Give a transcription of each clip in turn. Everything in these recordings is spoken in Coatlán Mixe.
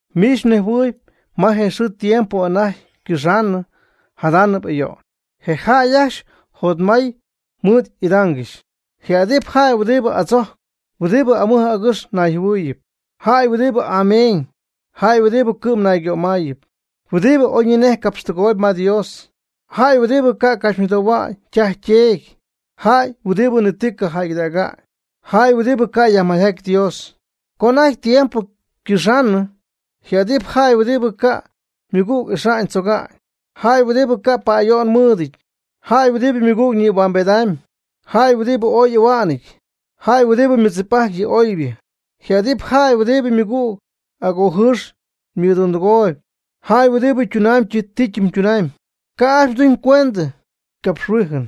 Miich mnejhuɨɨyb ma je xɨɨ tiempo anajty ycɨxaanɨ jadaanɨp ayo'n, je jäy ajcxy jotmay mɨɨd y'idaangɨxy. Ji adɨpy jäy huɨdibɨ adzojcp, huɨdibɨ amɨj agɨx nayjɨhuɨɨyɨp, jäy huɨdibɨ ameeñ, jäy huɨdibɨ cɨ'm naygömayɨɨb, huɨdibɨ oyñinej capxtɨgooyb ma Dios, jäy huɨdibɨ ca' capxymɨdohua'ñ ytaj yteedy, jäy huɨdibɨ ni ti ca' jäygɨdäga'ñ, jäy huɨdibɨ ca' yajmay'aty Dios. Co anajty tiempo ycɨxaanɨ, ji adɨpy jäy huɨdibɨ ca' ymɨgüg ixa'ñ tzoga'ñ, jäy huɨdibɨ ca' pa'ayo'n mɨɨdɨty, jäy huɨdibɨ ymɨgüg nïhuambejtp, jäy huɨdibɨ oy ahua'nɨty, jäy huɨdibɨ mɨdzip'ajtp yɨ oybɨ. Ji adɨpy jäy huɨdibɨ ymɨgüg agojɨɨx mɨdundɨgooyb, jäy huɨdibɨ ytunamyb ti ytunamyb, ca' ajcxy tuñ cuendɨ capxhuijɨn,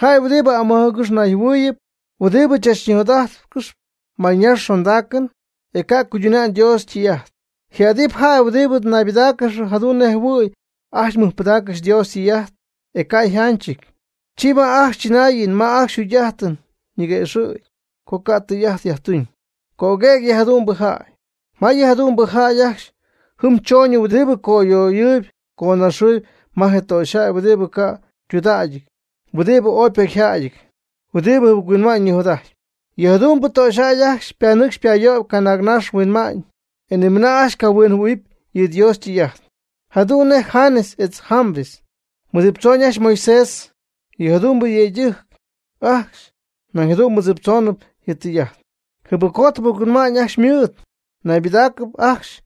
jäy huɨdibɨ amɨj agɨx nayjɨhuɨɨyɨp, huɨdibɨ tzachnijot'ajtcɨxy mayñaxy xondaacɨn, e ca' cuyduna'ñ Dios ytɨy'ajt. Ji adɨpy jäy huɨdibɨ naybɨdáacɨgɨxp jadu'n nej jɨhuɨ̈y ajcxy mɨjpɨdaaccɨxp Dios ytɨy'ajt e ca' yjanchɨty. Chi ma ajcxy chɨnaayɨn ma ajcxy yjugy'ajtɨn ñiguëxɨ̈cp co ca' tɨy'ajt yajtuñ. Cöguëg yɨ jadu'mbɨ jäy. Ma yɨ jadu'mbɨ jäy ajcxy jɨm chooñɨty huɨdibɨ coyöyɨɨb conaxɨɨb ma je töxyjäy huɨdibɨ ca' ytudägɨty, huɨdibɨ oy ypocyjäyɨty, huɨdibɨ jɨbɨc-huinma'ñ nijot'ajtp. Yɨ jadu'mbɨ töxyjäy ajcxy panɨcxp payöyp canaagnax huinma'ñ, e nimɨnaa ajcxy cahuinjɨhuɨ̈huɨpy yɨ Dios ytɨy'ajt. Jadu'n nej Janes etz Jambres mɨdziptzooñ je Moisés, yɨ jadu'mbɨ yëydɨjc ajcxy nañ jadu'n mɨdziptzoonɨp yɨ tɨy'ajt. Jɨbɨcjot jɨbɨc-huinma'ñ ajcxy ymɨɨd. Ñaybɨdägɨɨb ajcxy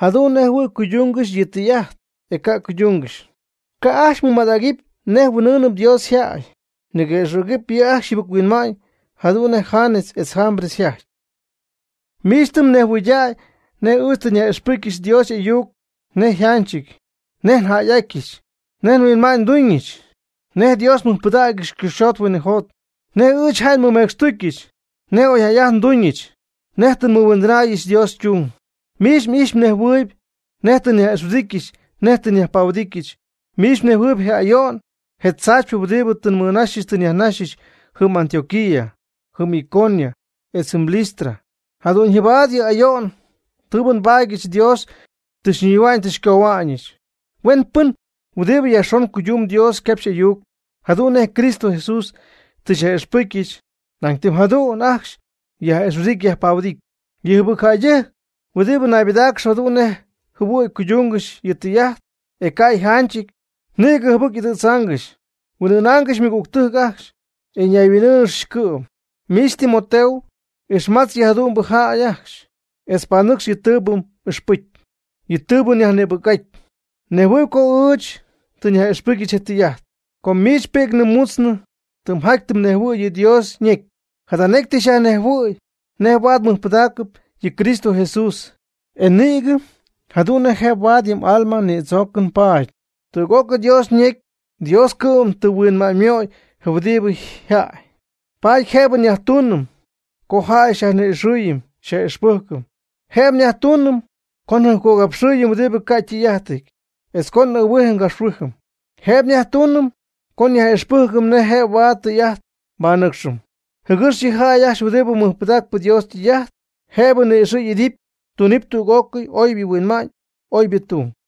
jadu'n nej jɨhuɨ̈y cuydungɨxy yɨ tɨy'ajt, e ca' cuydungɨxy. Ca' ajcxy mɨmadägɨpy nej huin'ɨɨnɨpy Dios yjäy. Niguëxɨ̈gɨpy yɨ' ajcxy yjɨbɨc-huinma'ñ jadu'n nej Janes etz Jambres yjajty. Miich tɨ mhuinjɨhuɨydäy nej ɨɨch tɨ nyaj'ixpɨcy Dios y'ayuc nej njäy'atyɨch, nej nhuinma'ñ nduuñɨch, nej Dios nmɨjpɨdägyɨch cɨxyjot huinɨjot, nej ɨɨch jäy nmɨmecxtucyɨch, nej oyjäy'ajtɨn nduuñɨch, nej tɨ nmɨhuindɨnäyɨch Dios ytung. Miich m'ijxyp mnejhuɨɨyb nej tɨ nyaj'ixhuɨdityɨch nej tɨ nyajpahuɨdityɨch, miich mnejhuɨɨyb je ayo'n je tzaachypɨ huɨdibɨ tɨ nmɨnaxyɨch tɨ nyajnaxyɨch jɨm Antioquía, jɨm Iconio, etz jɨm Listra. Jadu'ñyɨbaad yɨ ayo'n tɨɨbɨ nbaadyɨch Dios tɨ xyñihua'ñ tɨ xycohua'ñɨch. Huen pɨn huɨdibɨ yajxon cuydumb Dios ycapxy y'ayuc jadu'n nej Cristo Jesús tɨ xyyaj'ixpɨcyɨch, nañ tɨm jadu'n ajcxy yaj'ixhuɨdidɨpy yajpahuɨdidɨpy. Yɨ jɨbɨc jäydɨjc huɨdibɨ naybɨdáacɨgɨxp jadu'n nej jɨhuɨ̈y cuydungɨxy yɨ tɨy'ajt, e ca' yjanchɨty, nïgɨ jɨbɨc y'ɨdɨ̈dzaangɨxy. Huin'ɨɨnaangɨxy ymɨgügtɨjc ajcxy, e ñayhuin'ɨɨnáanɨgɨxy cɨ'm. Miich Timoteo, ixmatz yɨ jadu'mbɨ jäy ajcxy etz panɨcx yɨ tɨɨbɨ m'ixpɨcy, yɨ tɨɨbɨ myajnïbɨc'aty. Mnejhuɨɨyb co ɨɨch tɨ nyaj'ixpɨcyɨch je tɨy'ajt. Com miich pi'cnɨ mutznɨ tɨ mjaty tɨ mnejhuɨ̈y yɨ Dios ñecy. Jada necy tɨ xyajnejhuɨ̈y nej huaad mɨjpɨdägy yɨ Cristo Jesús, e nïgɨ jadu'n jëb huaad yɨ m'alma nïdzoocɨn paady. Tüg'ócɨy Dios ñecy Dios cɨ'm tɨ huinma'ñymöy je huɨdibɨ jaay. Paady jëbɨ nyajtuunɨm co jäy nyajni'ixɨɨyɨm nyaj'ixpɨjcɨm. Jëb nyajtuunɨm co njɨjpcogapxɨɨyɨm huɨdibɨ ca' ytɨy'ajtɨty, etz co n'ɨɨhuijɨm ngapxhuijɨm. Jëb nyajtuunɨm co nyaj'ixpɨjcɨm nej jëb huaad tɨy'ajt nbanɨcxɨm, jɨgɨx yɨ jäy ajcxy huɨdibɨ mɨjpɨdacp Dios ytɨy'ajt, jëb ni'ixɨ' y'idɨpy, tunɨpy tüg'ócɨy oybɨ huinma'ñ oybɨ tung.